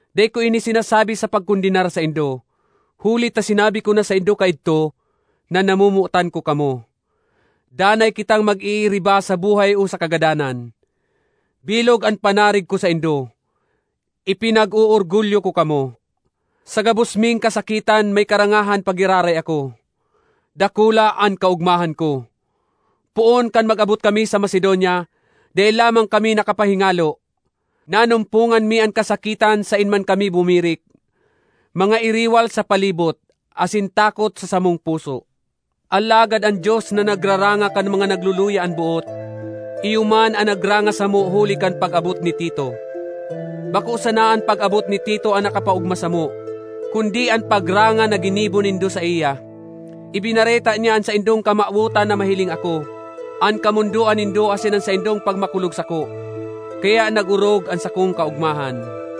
Dai ko ini sinasabi sa pagkondenar saindo, huli ta sinabi ko na saindo kaidto, na namomotan ko kamo; danay kitang mag-iiriba sa buhay o sa kagadanan. Bilog an panarig ko saindo; ipinag-oorgulyo ko kamo! Sa gabos ming kasakitan may karangahan pa giraray ako; dakula an kaogmahan ko! Poon kan mag-abot kami sa Macedonia, dai lamang kami nakapahingalo. Nanumpongan mi an kasakitan saen man kami bumirik—mga iriwal sa palibot, asin takot sa samong puso. Alagad an Dios, na nagraranga kan mga nagluluya an boot, iyo man an nagranga samo huli kan pag-abot ni Tito. Bako sana an pag-abot ni Tito an nakapaogma samo, kundi an pagranga na ginibo nindo saiya. Ibinareta niya an saindong kamawotan na mahiling ako, an kamondoan nindo asin an saindong pagmakulog sako, kaya nag-orog an sakong kaogmahan.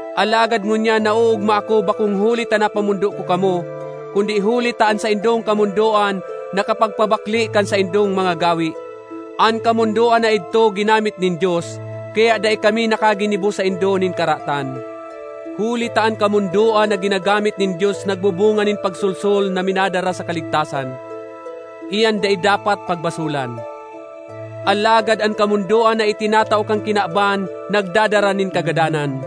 Alagad ngunyan naoogma ako bakong huli ta napamondo ko kamo, kundi huli ta an saindong kamondoan nakapagpabakle kan saindong mga gawe. An kamondoan na idto ginamit nin Dios, kaya dai kami nakaginibo saindo nin karatan. Huli ta an kamondoan na ginagamit nin Dios nagbubunga nin pagsolsol na minadara sa kaligtasan—iyan dai dapat pagbasolan! Alagad an kamondoan na itinatao kan kinaban nagdadara nin kagadanan.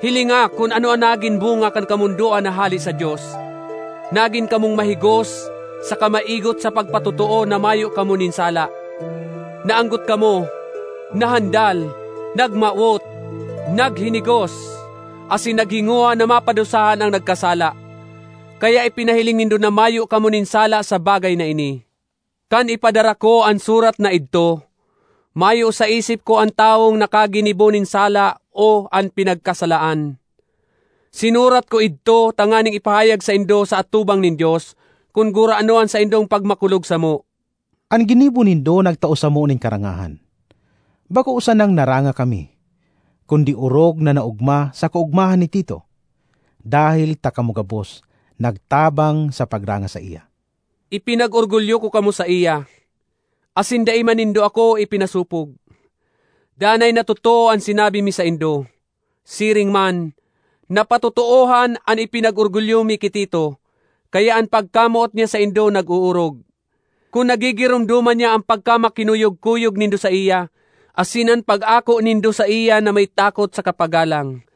Hilinga kun ano an nagin bunga kan kamondoan na hale sa Dios: nagin kamong mahigos saka maigot sa pagpatotoo na mayo kamo nin sala. Naanggot kamo, nahandal, nagmawot, naghinigos asin naghingowa na mapadusahan an nagkasala. Kaya ipinahiling nindo na mayo kamo nin sala sa bagay na ini. Kan ipadara ko an surat na idto, mayo sa isip ko an tawong nakaginibo nin sala o an pinagkasalaan. Sinurat ko idto tanganing ipahayag saindo, sa atubang nin Dios, kun gurano an saindong pagmakulog samo. An ginibo nindo nagtao samo nin karangahan. Bako sanang naranga kami, kundi orog na naogma sa kaogmahan ni Tito, dahel ta kamo gabos nagtabang sa pagranga saiya! Ipinag-orgulyo ko kamo saiya, asin dai man nindo ako ipinasopog. Danay na totoo an sinabi mi saindo; siring man, napatotoohan an ipinag-orgulyo mi ki Tito. Kaya an pagkamoot niya saindo nag-oorog, kun nagigiromdoman niya an pagkamakinuyog-kuyog nindo saiya, asin an pag-ako nindo saiya na may takot saka paggalang.